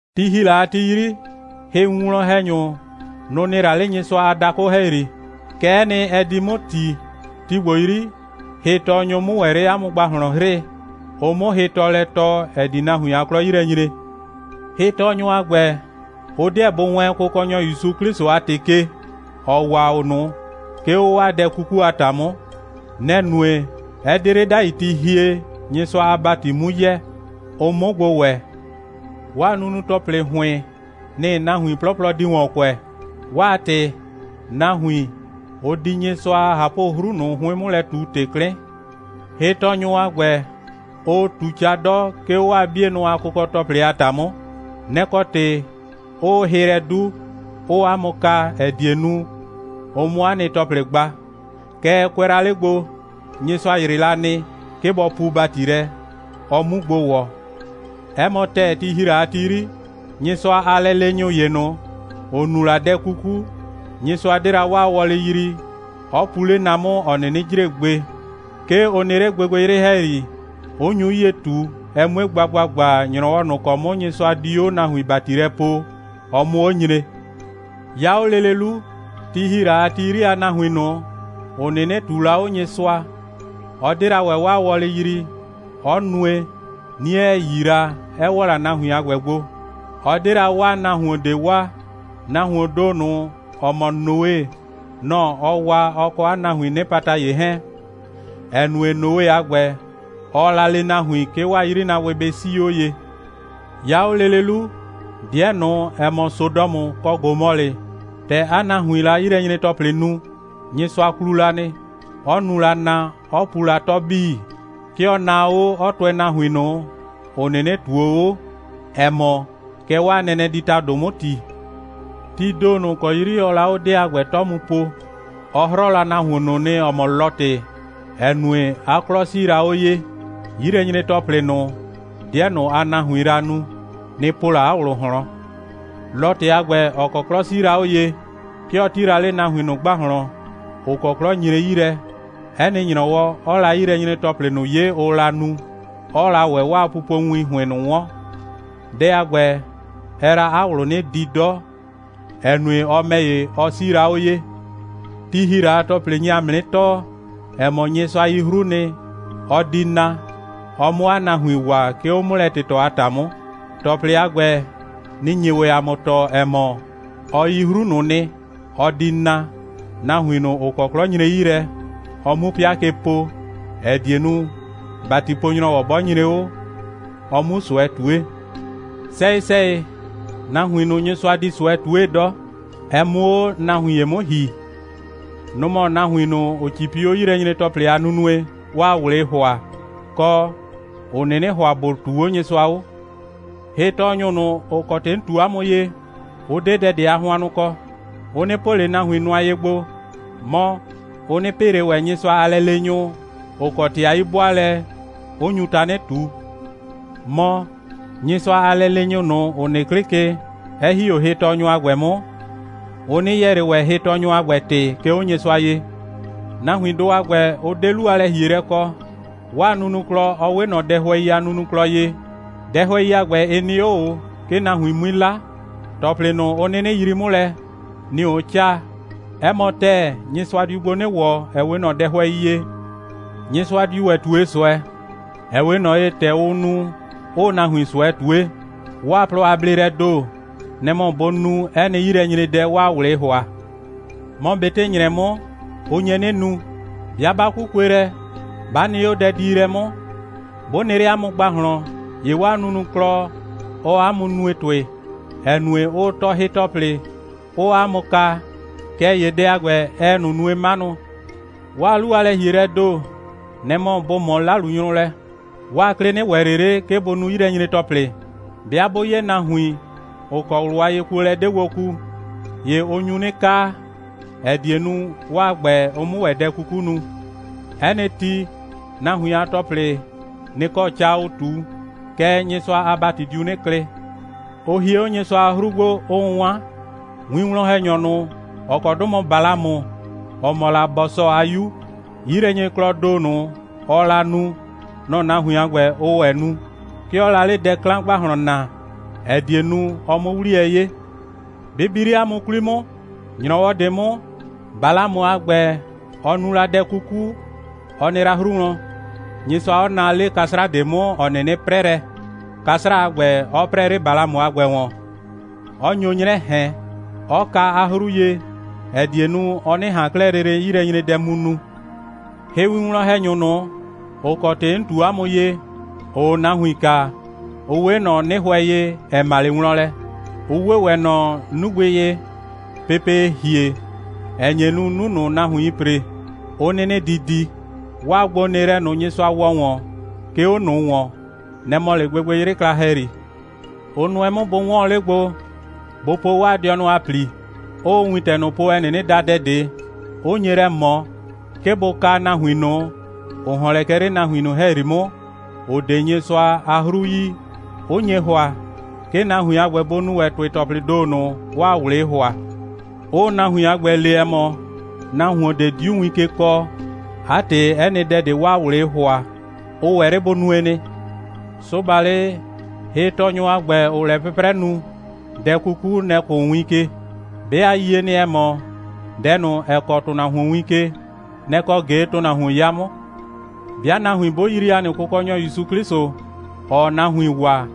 Ti ‑hi la a ti 'yri, hɩwinwlɔn‑hɛnyʋ, nʋ‑ nɩ la 'le Nyɩsʋa a dakʋ ‑hɛyri. Kɛ'ɛ nɩ, ɛ di 'mʋ ‑ti, ti ‑gbo 'yri, hɩtɔɔnyʋ 'mʋ ‑wɛ 'le 'a mʋ ‑gbahlɔn 'hrɩɩ, ʋ 'mʋ hɩtɔɔlɛ tɔɔ, ‑ɛ di nahuin a 'klɔ 'yi lɛ nyre. Hɩtɔɔnyʋ a ‑gbɛ, ʋ 'dɩɛ bʋ wɛɛn Kʋkɔnyɔ ‑Yusu 'Klɩsʋ a ‑tɩ ke, ‑ɔ waa o ꞊nʋ, 'ke 'o 'waa dɛ 'kuku a ‑ta 'mʋ. Nɛ‑ nue, 'ɛ 'de 'le 'dai ti hie, Nyɩsʋa a ‑bati 'mu yɛ, ʋ 'mʋ gbo ‑wɛ. 'Waa nunu‑tɔplɩ ‑hʋɩn, nɩ‑ nahuin 'plɔplɔ di ‑wɔn kʋɛ. 'Waa ‑tɩ, nahuin, ʋ di Nyɩsʋa a ꞊hapʋ'hru ꞊nʋ 'hʋɩn 'mʋ lɛ ꞊tu ‑tɩ 'klɩn. Hɩtɔɔnyʋ a ‑gbɛ, ʋʋ ꞊tu ca 'dɔ, 'ke 'o 'waa 'bienʋ a kʋkɔ‑tɔplɩ a ‑ta 'mʋ. Nɛ‑ kɔ ‑tɩ, 'ʋʋ hɩ lɛ 'du, 'ʋʋ 'a mʋ kaa, ‑ɛ die nu, ʋ 'mʋ 'a nɩ ‑tɔplɩ gba. Kɛɛ, kʋɛ la 'le gbo, Nyɩsʋa ‑yrɩ la nɩ, 'ke bɔ puu ‑bati lɛ, ɔ 'mu gbo ‑wɔ. 'Ɛ mɔ ‑tɛɛ, ti ‑hi la a ti 'yri, Nyɩsʋa a lɛleenyʋ ‑ye ꞊nʋ, ‑ʋ nu la dɛ 'kuku, Nyɩsʋa 'de la ‑wɛ 'waa wɔlɩ yrii, 'ɔ pu 'le na 'mʋ, ‑ɔ 'nɩnɩ jre gbe. 'Ke ʋ nɩ 'le gbɩgbɩyrɩ ‑hɛyri, 'ʋ nyu 'yie ꞊tu, ɛ 'mue gba ‑gbagba, ‑nyrɔwɔ ꞊nʋ ‑kɔ 'mʋ Nyɩsʋa di 'o nahuin ‑bati lɛ poo, ɔ 'mʋ 'o nyre. 'Ya 'o lele 'lu, ti ‑hi la a ti 'yri a nahuin ꞊nʋ, ‑ʋ 'nɩnɩ ꞊tuu la 'o Nyɩsʋa, ɔ 'de la ‑wɛ 'waa wɔlɩ yrii, 'ɔ nue, 'nie 'ɛ 'yi la, 'ɛ ‑wɔ la nahuin a ‑gbɛ gbo. Ɔ 'de la 'waa nahuon ꞊de waa. Nahuoon ‑do ꞊nʋ, ‑ɔ mɔ Noe, nɔ‑ ɔ waa, ɔ kɔ nahuiin 'nɩpata ‑ye 'hɛɛn, ‑ɛ nue, Noe a ‑gbɛ, ɔɔ la le nahuin, 'ke 'waa 'yrinaabʋɩ bɩ 'sii 'o ye. 'Ya 'o lele 'lu, 'dɩɛ ꞊nʋ, ‑ɛ mɔ, Sodɔmʋ kɔ Gomɔlɩ, ‑tɛ 'a nahuiin la 'yilɛnyre‑tɔplɩ nu, Nyɩsʋa klu la nɩ, 'ɔ nu la na, 'ɔ pu la 'tɔ 'bii. 'Ke ɔ naa 'o, 'ɔ tʋɛ nahuin ꞊nʋ, ‑ʋ 'nɩnɩ ꞊tuo 'o, ‑ɛ mɔ, kɛ 'waa nɛnɛ di ‑tado 'mʋ ‑ti. Tii ‑do ꞊nʋ ‑kɔ 'yri ɔɔ la 'o 'dɩɛ a ‑gbɛ 'tɔ mu po, ɔ 'hrɔɔ la nahuon ꞊nʋ nɩ, ‑ɔ mɔ Lɔtɩ, ‑ɛ nue, 'a 'klɔ 'sii la 'o ye. 'Yilɛnyre‑tɔplɩ ꞊nʋ, 'dɩɛ ꞊nʋ a nahuiin la nu, nɩ‑ po la 'a ꞊wlʋ ꞊hlɔn. Lɔtɩ a ‑gbɛ, ‑ɔ kɔ 'klɔ 'sii la 'o ye, 'ke ɔ 'ti la 'le nahuin ꞊nʋ ‑gbahlɔn, ‑ʋ kɔ 'klɔ nyre 'yi lɛ, 'ɛ nɩ ‑nyrɔwɔ, 'ɔɔ la 'yilɛnyre‑tɔplɩ ꞊nʋ 'ye, ʋʋ la nu, 'ɔɔ la ‑wɛ 'waa pupowin ‑hʋɩn ꞊nʋ 'wɔn. Dɛ a ‑gbɛ, ɛɛ la 'a ꞊wlʋ 'nɩ di 'dɔ, ‑ɛ nue, ɔ ‑mɛ ‑ye, ɔ 'sii la 'o ye. Ti ‑hi la a ‑tɔplɩ nye ‑a mʋ 'nɩ tɔɔ, ‑ɛ mɔ, Nyɩsʋa yi 'hru nɩ, ɔ di na, ɔ 'mʋ 'a nahuin waa, 'ke 'o 'mʋlɛ꞊tɩtɔ a ‑ta 'mʋ. ‑Tɔplɩ a ‑gbɛ, nɩ‑ nye ‑wɛ ‑a mʋ tɔɔ, ‑ɛ mɔ, ɔ yi 'hru ꞊nʋ nɩ, ɔ di na, nahuin ꞊nʋ, ‑ʋ kɔ 'klɔ nyre 'yi lɛ, ɔ 'mu 'pɩa ke po, ‑ɛ die nu, ‑batipo‑nyrɔwɔ 'bɔ nyre 'o, ɔ 'mu ꞊sʋɛ ꞊tue. Sɛyɩ‑sɛyɩ, nahuin ꞊nʋ, Nyɩsʋa di ꞊sʋɛ ꞊tue 'dɔ, ɛ 'mʋ 'o nahuin ‑ye 'mʋ ‑hi, nʋ‑ mɔ nahuin ꞊nʋ, ‑ʋ 'cipi 'o 'yilɛnyre‑tɔplɩ ꞊nʋ a nunue, 'waa ꞊wlɩɩ ‑hʋa, kɔ, ‑ʋ 'nɩnɩ ‑hʋa ‑bʋ ꞊tuu 'o Nyɩsʋa 'o. Hɩtɔɔnyʋ ꞊nʋ, ‑ʋ kɔ ‑tɩ 'n ꞊tu 'a mʋ ye, ʋ 'de dɛ ꞊de a hʋannʋ kɔ. Ʋ 'nɩ po ꞊le nahuon ꞊de nʋa ye gbo, mɔ, ʋ 'nɩ pɩ ꞊le ‑wɛ Nyɩsʋa a lɛleenyʋ, ‑ʋ kɔ ‑tɩ a 'yi'bʋaalɛ, 'ʋ nyu tanɩ ꞊tu. Mɔ, Nyɩsʋa a lɛleenyʋ ꞊nʋ, ‑ʋ nɩ 'klɩ ke, 'ɛ ‑hi 'o hɩtɔɔnyʋ a ‑gbɛ 'mʋ, ʋ 'nɩ yɛɛ ꞊le ‑wɛ hɩtɔɔnyʋ a ‑gbɛ ‑tɩ, 'ke 'o Nyɩsʋa ye. Nahuindʋ a ‑gbɛ, ʋ 'de 'lu a lɛ‑hielɛ kɔ. 'Waa nunuklɔ, ɔ 'we ꞊nɔ dɛhʋɛi a nunuklɔ ye. Dɛhʋɛi a ‑gbɛ, ɩ nɩ 'o ꞊o, 'ke nahuin 'mui 'la. ‑Tɔplɩ ꞊nʋ, ʋ 'nɩnɩ yrii 'mʋ lɛ, nɩ‑ ʋʋ 'caa. 'Ɛ mɔ ‑tɛɛ, Nyɩsʋa diu gbo 'nɩ ‑wɔ, ‑ɛ 'we ꞊nɔ dɛhʋɛi ye. Nyɩsʋa diu ‑wɛ ꞊tue ꞊sʋɛ, ‑ɛ 'we ꞊nɔ ye, ‑tɛ ʋʋ nu, 'ʋʋ nahuin ꞊sʋɛ ꞊tue. 'Waa plɔ a bleelɛɛ ‑do, nɛ‑ mɔ bʋ nu 'ɛ nɩ 'yilɛnyredɛ, 'waa ꞊wlɩɩ ‑hʋa. Mɔ, ꞊betɩ ‑nyrɛ 'mʋ, ʋ nye 'nɩ nu. 'Bɩa 'ba 'kukue lɛ, 'ba nɩ 'o dɛdiilɛ 'mʋ, 'bʋ nɩ 'le 'a mʋ ‑gbahlɔn, ‑ye 'waa nunuklɔ, ɔɔ 'a mʋ nue ‑tʋɩ, ‑ɛ nue, ʋʋ tɔɔ hɩ‑tɔplɩ, 'ʋʋ 'a mʋ kaa. Kɛɛ ‑ye dɛ a ‑gbɛ, ɛɛ ꞊nʋ nue 'manʋ. 'Waa 'lu a lɛ‑hielɛɛ ‑do, nɛ‑ mɔ bʋ ꞊mɔ 'lalunyrʋ lɛ. 'Waa 'klɩ 'nɩ ‑wɛ ꞊le 'le, 'ke bʋ nu 'yilɛnyre‑tɔplɩ. 'Bɩa 'bʋ 'ye nahuin, ‑ʋ kɔ ꞊wlʋ a yekuolɛ 'de gbo ku, ‑ye ʋ nyu 'nɩ kaa, ‑ɛ die nu, 'waa ‑gbɛ, ʋ 'mʋ ‑wɛ dɛ 'kuku nu. 'Ɛ nɩ ti, nahuin a ‑tɔplɩ, nɩ‑ kɔ ca ʋʋ ꞊tu. Kɛɛ, Nyɩsʋa a ‑bati diu 'nɩ klɩ. Ʋ hie 'o Nyɩsʋa a 'hru gbo, 'ʋʋ 'wan. Winwlɔn‑hɛnyɔ ꞊nʋ, ‑ɔ kɔ 'dʋ mɔ la Balamʋ, ‑ɔ mɔ la Bɔsɔ a 'yu, 'yilɛnyreklɔɔ ‑do ꞊nʋ, ɔɔ la nu, nɔ‑ nahuin a ‑gbɛ, ʋʋ ‑wɛ nu. 'Ke ɔɔ la 'le dɛ 'klan ‑gbahlɔn naa, ‑ɛ die nu, ɔ 'mʋ 'wliyɛ 'ye. Bɩ bi 'le 'a mʋ 'kwli 'mʋ, ‑nyrɔwɔ ꞊de 'mʋ, Balamʋ a ‑gbɛ, ‑ɔ nu la dɛ 'kuku, ɔ nɩ la 'hru wlɔn, Nyɩsʋa 'ɔ naa 'le 'kasra ꞊de 'mʋ, ‑ɔ 'nɩnɩ 'prɛ lɛ, 'kasra a ‑gbɛ 'ɔ 'prɛɛ 'le Balamʋ a ‑gbɛ ‑wɔn, 'ɔ nyo 'nyrɛ ꞊hɛn, 'ɔ ka 'a 'hru ye, ‑ɛ die nu, ɔ 'nɩ ꞊han 'klɛɛ lele 'yilɛnyredɛ mu nu. Hɩwinwlɔn‑hɛnyʋ ꞊nʋ, ‑ʋ kɔ ‑tɩ 'n ꞊tu 'a mʋ ye, ‑ʋʋ nahuin kaa, ʋ 'we ꞊nɔ 'nɩhʋɛ ye, ‑ɛ ma 'le wlɔn lɛ. Ʋ 'we ‑wɛ ꞊nɔ 'nugbɩ ye, pepee ‑hie, ‑ɛ nye nu, 'nu ꞊nʋ, nahuiin ‑pre, 'ʋ 'nɩnɩ di di. 'Waa gbonɩɩlɛ ꞊nʋ, Nyɩsʋa ‑wɔ ‑wɔn, 'ke 'o ꞊nʋ ‑wɔn, nɛ‑ mɔ 'le gbɩgbɩyrɩ kla ‑hɛyri. Ʋ nʋɛ 'mʋ bʋ 'wɔɔn 'le gbo, bʋ po 'waa dɩɔnʋ a ‑pli, 'ʋʋ wintɛ ꞊nʋ po, ‑ɛ 'nɩnɩ da dɛ ꞊de, 'ʋ nye lɛ ꞊mɔ, 'ke bʋ kaa nahuin ꞊nʋ, ‑ʋ ‑hɔn lɛ kɛ 'le nahuin ꞊nʋ ‑hɛyri 'mʋ, ‑ʋ 'de Nyɩsʋa a 'hru yi, 'ʋ nye ‑hʋa, 'ke nahuin a ‑gbɛ, bʋ nu ‑wɛ ‑tʋɩ‑tɔplɩɩ ‑do ꞊nʋ, 'waa ꞊wlɩɩ ‑hʋa, 'ʋʋ nahuin a ‑gbɛ le, ‑ɛ mɔ, nahuon ꞊de 'diu win ke kɔɔ, 'a ‑tɩ, 'ɛ nɩ dɛ ꞊de, 'waa ꞊wlɩɩ ‑hʋa, ʋ ‑wɛ 'le bʋ nue nɩ. Sʋbalɩ, hɩtɔɔnyʋ a ‑gbɛ, ‑ʋʋ lɛ 'pʋprɛ nu, dɛ 'kuku, nɛ‑ kʋʋ win ke. 'Be a yie nɩ, ‑ɛ mɔ, dɛ ꞊nʋ, ‑ɛ kɔɔ ‑tʋnahuon win ke, nɛ‑ kɔ ꞊ge ‑tʋnahuon 'ya 'mʋ. 'Bɩa nahuin 'bʋ yrii ‑a nɩ Kʋkɔnyɔ ‑Yusu 'Klɩsʋ, ‑ɔɔ nahuin waa,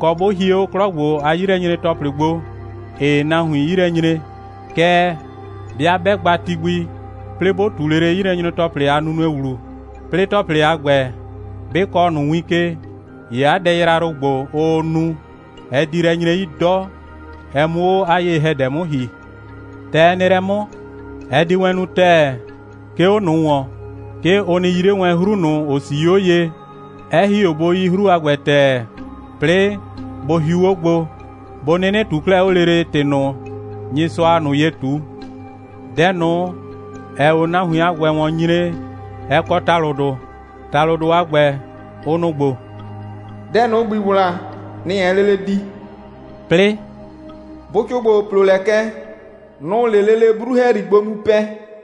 kɔ, 'bʋ hie 'o 'klɔ ‑gbo a 'yilɛnyre‑tɔplɩ gbo, ‑ɩɩ nahuin 'yi lɛ nyre, kɛɛ, 'bɩa 'bɛ gba ti gbi, 'plɩɩ 'bʋ ꞊tu lele 'yilɛnyre‑tɔplɩ a nunue ‑wlu, 'plɩɩ ‑tɔplɩ a ‑gbɛ 'bɩ kɔɔ ꞊nʋ win ke, ‑ye 'a dɛ yrayrʋ ‑gbo, ʋʋ nu, ɛ di lɛ nyre 'yi 'dɔ, ɛ 'mʋ 'o 'a ye‑hɛdɛ 'mʋ ‑hi. ‑Tɛ ɛ nɩ lɛ 'mʋ, ɛ di wɛn nu ‑tɛɛ, 'ke 'o ꞊nʋ ‑wɔn, 'ke ʋ nɩ yi 'le wɛn 'hru ꞊nʋ, ‑ʋ 'sii 'o ye, 'ɛ ‑hi 'o bʋ yi 'hru a ‑gbɛ ‑tɛɛ, 'plɩɩ bʋ hiu 'o gbo, bʋ 'nɩnɩ ꞊tuu 'klɛɛ 'o lele ‑tɩ ꞊nʋ, Nyɩsʋaa ꞊nʋ ye ꞊tu. Dɛ ꞊nʋ, ‑ɛɛ 'o nahuin a ‑gbɛ ‑wɔn nyre, ɛ kɔ ‑talʋdʋ. ‑Talʋdʋ a ‑gbɛ, ʋ nʋ‑ ‑gbo: «Dɛ ꞊nʋ, ‑gbii ‑wla, nɛ‑ ɛɛ lele di,» 'plɩɩ: «Bʋcʋ ‑gbo, ʋ ‑plo lɛ kɛ, nʋ‑ʋ 'le lele 'bru ‑hɛyri gbo mu pɛ.»